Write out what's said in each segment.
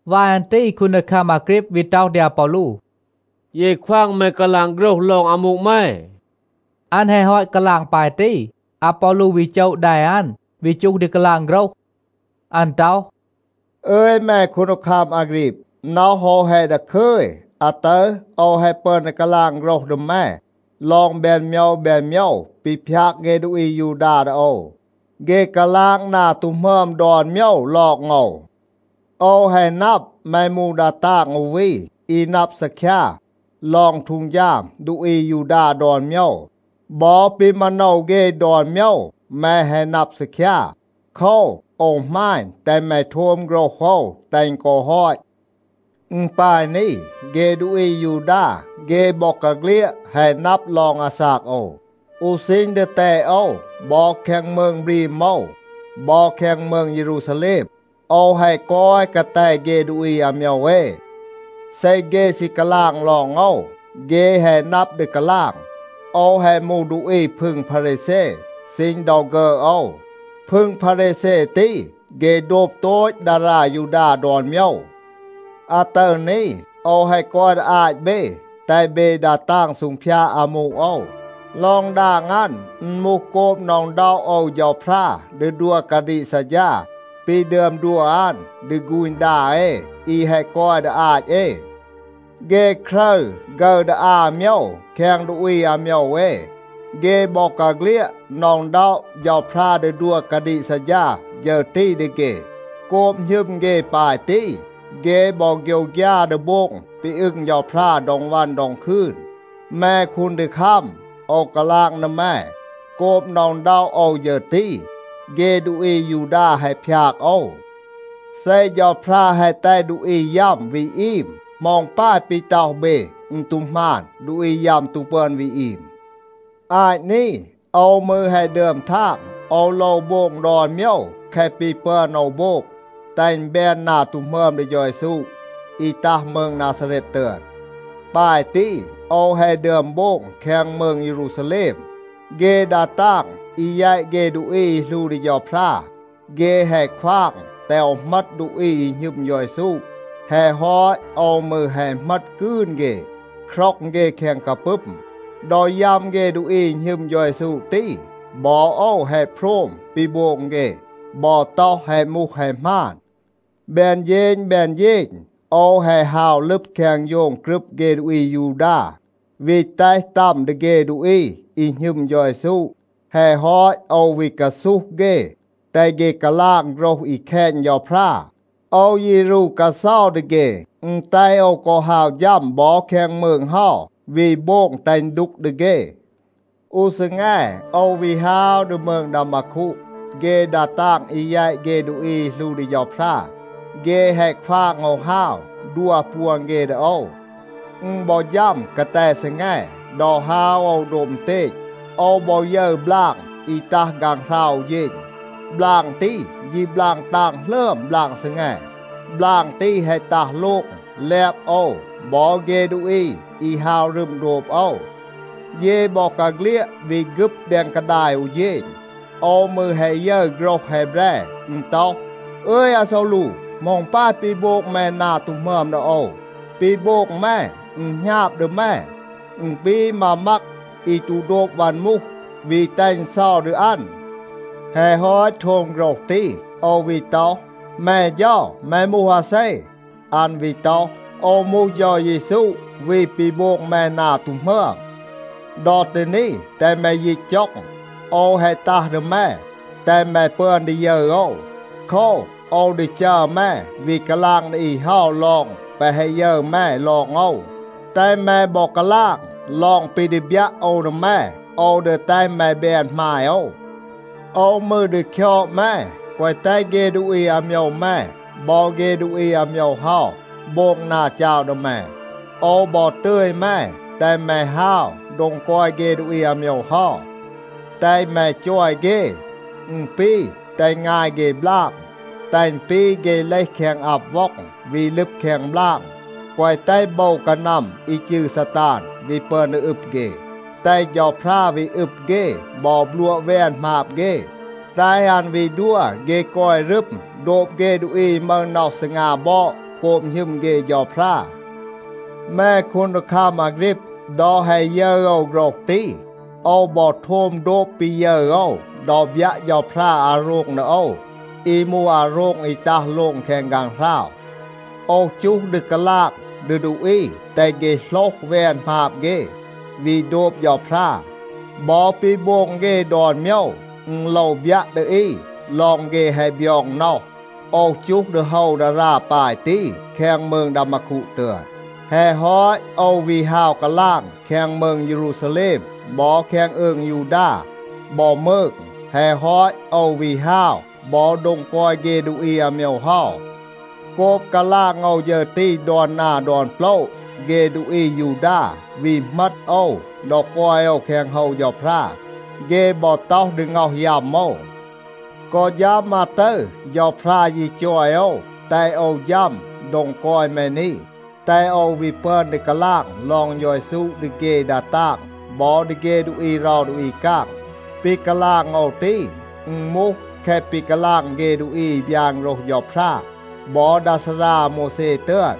วาย อัน ตี คูนดีคัม อาฆรีบ วี ต็อห ดี อาปอลู, “เย ควาง แม กาลาง โฆรห ลอง อามู แม.” อัน แฮะ ฮอต กาลาง ปาย ตี, อาปอลู วี โจะ แด อัน, วี จูห ดี กาลาง โฆรห. อัน ต็อห, “อึย แม คูนดีคัม อาฆรีบ, น็อห โอว แฮะ ดาคึย. อาตึร โอว แฮะ ปึอน ดี กาลาง โฆรห ดี แม ลอง แบน โมยว แบน โมยว ปี พยาก เฆ ดูอี อายูดา ดี โอว. เฆ กาลาง นา ตู หมึอม ดอน โมยว ลอง โอว. โอว แฮะ นับ, แม มูห ดา ตาง อู วี, อี นับ ซีคยา ลอง ฮีด ดูอี อายูดา ดอน โมยว. บอ ปี มาโนว เฆ ดอน โมยว แม แฮะ นับ ซีคยา. โคว, โอว หมาณ, แตห แม โทม โฆรห โอว, แตห อึณ กอ ฮอต. อึณ ปาย นี. เฆ ดูอี อายูดา, เฆ บอกาเฆลียด แฮะ นับ ลอง อาซาก โอว. อู ซีณ ดีแตด โอว บอ แคง มืง บรีม โอว บอ แคง มืง เยรูซาแลม, โอว แฮะ กอย กาแต เฆ ดูอี อาโมยว เอ. เซ เฆ ซี กาลาง ลอง โอว, เฆ แฮะ นับ ดี กาลาง. โอว แฮะ มูห ดูอี พึง พารีแซ ซีณ ดอ ฆึอด โอว. พึง พารีแซ ตี, เฆ โดบ โตต ดารา ยูดา ดอน โมยว. อาตึร นี, โอว แฮะ กอย ดี อาต เบ, แตห เบ ดา ตาง ซูงพยาด อามู โอว. ลอง ดาง อัน, อึณ มูห โกบ หน็อะ อึณด็อะ โอว เฌาพรา ดี ดัว กาดีก ซัดฌา ปี ดึอม ดัว อัน ดี ฆูณ ดา เอ, อี แฮะ กอย ดี อาต เอ. เฆ ครึร ฆึร ดี อา โมยว แคง ดูอี อาโมยว เอ, เฆ บอกาเฆลียด หน็อะ อึณด็อะ เฌาพรา ดี ดัว กาดีก ซัดฌา ฌึร ตี ดี เฆ. โกบ หณึม เฆ ปาย ตี, เฆ บอ โฆยวฆยา ดี โบง ปี อึง เฌาพรา ดอง วัน ดอง คืน. แม คูนดีคัม, โอว กาลาง ดี แม, โกบ หน็อะ อึณด็อะ โอว ฌึร ตี, เฆ ดูอี อายูดา แฮะ พยาก โอว. เซ เฌาพรา แฮะ แตห ดูอี ยัม วี อีม, เหมา อึณ ปาย ปี ต็อห เบ, อึณ ตู หมาน, ดูอี ยัม ตู ปึอน วี อีม. อาต นี, โอว มืร แฮะ ดึอม ทาง, โอว โลว โบง ดอน โมยว แคะ ปี ปึอน โอว โบง, แตห อึณ แบน นา ตู หมึอม ดี เฌา เยซู อี ตัห มืง นาซาเรต ตึอน. ปาย ตี โอว แฮะ ดึอม โบง แคง มืง เยรูซาแลม. เฆ ดา ตาง อี แยต เฆ ดูอี อี หลู ดี เฌาพรา, เฆ แฮะ ควาง แตห โอว เหมต ดูอี อี หณึม เฌา เยซู. แฮะ ฮอต โอว มืร แฮะ เหมต กืน เฆ, คร็อง เฆ แคง กาปึม. ดอ ยัม เฆ ดูอี อี หณึม เฌา เยซู ตี, บอ โอว แฮะ โพรม ปี โบง เฆ บอ ต็อห, แฮะ มูห แฮะ หมาน. แบน เฌณ แบน เฌณ, โอว แฮะ ฮาว ลึบ แคง โฌง กรึบ เฆ ดูอี อายูดา, วี แตห ตัม ดี เฆ ดูอี อี หณึม เฌา เยซู. แฮะ ฮอต โอว วี กาซูห เฆ, แตห เฆ กาลาง โฆรห อี แคณ เฌาพรา. โอว ยี รู กาเซา ดี เฆ. อึณ แตห โอว กอ ฮาว ฌัม บอ แคง มืง เฮา, วี โบง แตห อึณ ดูก ดี เฆ. อู ซีแง, โอว วี ฮาว ดี มืง ดามาคู. เฆ ดา ตาง อี แยต เฆ ดูอี อี หลู ดี เฌาพรา, เฆ แฮะ ควาง โอว ฮาว, ดัว ปวน เฆ ดี โอว. อึณ บอ ฌัม กาแต ซีแง, ดอ ฮาว โอว โดบ อึณเตณ, โอว บอ ยึร บลาง อี ตัห ฆางหราว อู เฌณ. บลาง ตี ยี บลาง ตาง หลึอม บลาง ซีแง. บลาง ตี แฮะ ตัห โลง, แลบ โอว บอ เฆ ดูอี อี ฮาว รึม โดบ โอว. เย บอกาเฆลียด วี ฆึบ แดง กาดาย อู เฌณ. โอว มืร แฮะ ยึร โฆรห แฮแบร. อึณ ต็อห, ‘อึย, อาซอลู, เหมา อึณ ปาย ปี โบง แม นา ตู หมึอม ดี โอว? ปี โบง แม, อึณ หณาบ ดี แม. อึณ ปี มา มัก อี ตู โดบ วัน มูห, วี แตห อึณ เซา ดี อัน.’ แฮะ ฮอต โทม โฆรห ตี, โอว วี ต็อห, ‘แม เฌา, แม มูห อาเซ?’ อัน วี ต็อห, ‘โอว มูห เฌา เยซู วี ปี โบง แม นา ตู หมึอม. ดอ ตี นี, แตห แม ยีต จ็อง. โอว แฮะ ตัห ดี แม, แตห แม ปึอน ดี ยึร โอว. โคว, โอว ดี จัร แม วี กาลาง ดี อี เฮา ลอง แปะ แฮะ ยึร แม ลอง โอว, แตห แม บอ กาลาง ลอง ปี ดี บยัะ โอว ดี แม. โอว ดี แตห แม แบน หมาย โอว. โอว มืร ดี คยอด แม, แกวะ แตห เฆ ดูอี อาโมยว แม บอ เฆ ดูอี อาโมยว เฮา โบง นา จาว ดี แม. โอว บอ ตึย แม, แตห แม ฮาว โดง กอย เฆ ดูอี อาโมยว เฮา, แตห แม จอย เฆ, อึณ ปี แตห งาย เฆ บลาง, แตห อึณ ปี เฆ เลห แคง อับ ว็อง, วี ลึบ แคง บลาง, แกวะ แตห โบว กานัม อี จืร ซาตาน วี ปึอน ดี อึบ เฆ, แตห เฌาพรา วี อึบ เฆ บอ บลัวะ แวน หมาบ เฆ, แตห อัน วี ดัว เฆ กอย รึม โดบ เฆ ดูอี อี มึห น็อห ซีงา บอด โกบ หณึม เฆ เฌาพรา.’ แม คูนดีคัม อาฆรีบ, ดอ แฮะ ยึร โอว โฆรห ตี, โอว บอ โทม โดบ ปี ยึร โอว ดอ บยัะ เฌาพรา อาโรง ดี โอว อี มูห อาโรง อี ตัห โลง แคง ฆางหราว. โอว จูห ดี กาลาง ดี ดูอี แตห เฆ โหลห แวน หมาบ เฆ, วี โดบ เฌาพรา. บอ ปี โบง เฆ ดอน โมยว, อึณ โลว บยัะ ดี อี ลอง เฆ แฮะ บยอง น็อห. โอว จูห ดี โฮว ดารา ปาย ตี แคง มืง ดามาคู ตึอน. แฮะ ฮอต โอว วี ฮาว กาลาง แคง มืง เยรูซาแลม บอ แคง อืง ยูดา บอ มืง. แฮะ ฮอต, โอว วี ฮาว บอ โดง กอย เฆ ดูอี อาโมยว เฮา. โกบ กาลาง โอว ฌึร ตี ดอน นา ดอน โปละ, เฆ ดูอี อายูดา วี เหมต โอว ดอ กอย โอว แคง โฮว เฌาพรา. เฆ บอ ต็อห ดี ง็อห ยัม โอว. กอ ฌัม อาตึร เฌาพรา ยี จอย โอว, แตห โอว ฌัม โดง กอย แม นี, แตห โอว วี ปึอน ดี กาลาง ลอง เฌา เยซู ดี เฆ ดา ตาง บอ ดี เฆ ดูอี เรา ดูอี กาง. ปี กาลาง โอว ตี, อึณ มูห แคะ ปี กาลาง เฆ ดูอี อี บยาน โฆรห เฌาพรา บอ ดา ซารา อาโมวแซ ตึอน.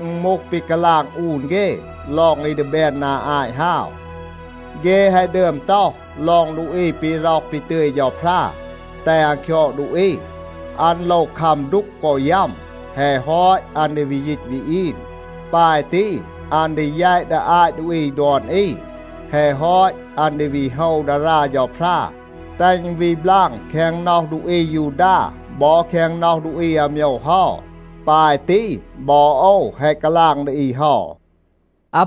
อึณ มูห ปี กาลาง อูน เฆ ลอง อี ดี แบน นา อาต ฮาว. เฆ แฮะ ดึอม ต็อห ลอง ดูอี ปี ร็อห ปี ตึย เฌาพรา แตห อัน คยอด ดูอี, อัน โลว คัม ดูก กอ ยัม. แฮะ ฮอต, อัน ดี วี ยีต วี อีม. ปาย ตี อัน ดี แยต ดี อาต ดูอี ดอน อี. แฮะ ฮอต, อัน ดี วี โฮว ดารา เฌาพรา, แตห อึณ วี บลาง แคง น็อห ดูอี อายูดา บอ แคง น็อห ดูอี อาโมยว เฮา. ปาย ตี บอ โอว แฮะ กาลาง ดี อี เฮา.”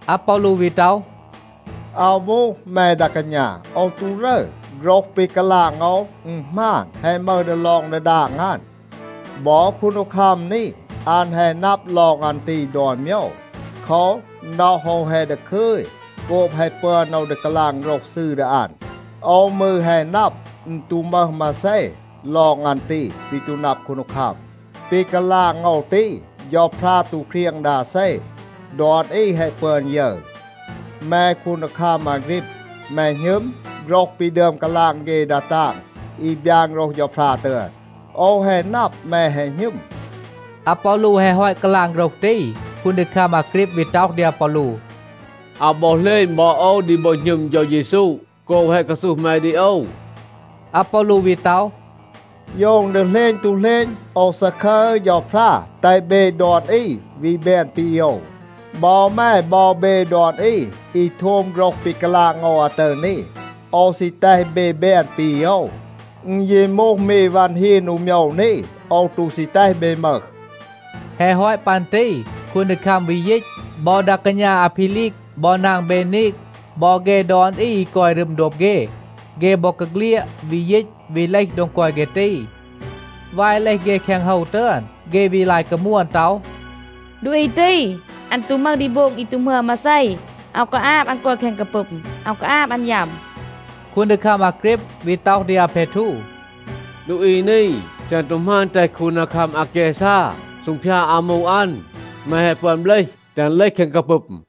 อาปอลู วี ต็อห, “อาว มูห, แม ดา กาณา, โอว ตู รึร. โฆรห ปี กาลาง โอว, อึณ หมาน, แฮะ มึห ดีลอง ดีดาง อัน. บอ คูนดีคัม นี, อัน แฮะ นับ ลอง อัน ตี ดอน โมยว. โคว, น็อห โอว แฮะ ดาคึย โกบ แฮะ ปึอน โอว ดี กาลาง โฆรห ซืร ดี อัน. โอว มืร แฮะ นับ, อึณ ตู มึห มาเซ ลอง อัน ตี ปี ตู นับ คูนดีคัม. ปี กาลาง โอว ตี, เฌาพรา ตู เครียง ดี อาเซ. ดอน อี แฮะ ปึอน ยึร. แม คูนดีคัม อาฆรีบ, แม หณึม โฆรห ปี ดึอม กาลาง เฆ ดา ตาง อี บยาน โฆรห เฌาพรา ตึอน? โอว แฮะ นับ, แม แฮะ หณึม.” อาปอลู แฮะ ฮอต กาลาง โฆรห ตี, คูนดีคัม อาฆรีบ วี ต็อห ดี อาปอลู, “อาว บอ เหลณ บอ โอว ดี บอ หณึม เฌา เยซู โกบ แฮะ กาซูห แม ดี โอว.” อาปอลู วี ต็อห, “โยว อึณ ดี เหลณ, ตู เหลณ, โอว ซาคึร เฌาพรา, แตห เบ ดอน อี วี แบน ปี โอว. บอ แม บอ เบ ดอน อี, อี โทม โฆรห ปี กาลาง โอว อาตึร นี, โอว ซี แตห เบ แบน ปี โอว. อึณ ยี มูห มี วัน ฮีน อู โมยว นี, โอว ตู ซี แตห เบ มึห.” แฮะ ฮอต ปัน ตี คูนดีคัม วี ยีต. บอ ดา กาณา อาเพลีก บอ นาง เบนีก, บอ เฆ ดอน อี อี กอย รึม โดบ เฆ, เฆ บอกาเฆลียด วี ยีต วี เลห โดง กอย เฆ ตี. วาย เลห เฆ แคง โฮว ตึอน, เฆ วี ลาย กามวน ต็อห, “ดูอี ตี, อัน ตู มึห ดี โบง อี ตู หมึอม มาเซ. อาว กาอาบ อัน กอย แคง กาปึม. อาว กาอาบ อัน ยัม.” คูนดีคัม อาฆรีบ วี ต็อห ดี อาเพทู, “ดูอี นี, เซ อัน ตู หมาณ, แตห คูนดีคัม อาแกซา ซูงพยาด อามู อัน, แม แฮะ ปึอน เบลห แตห อัน เลห แคง กาปึม.”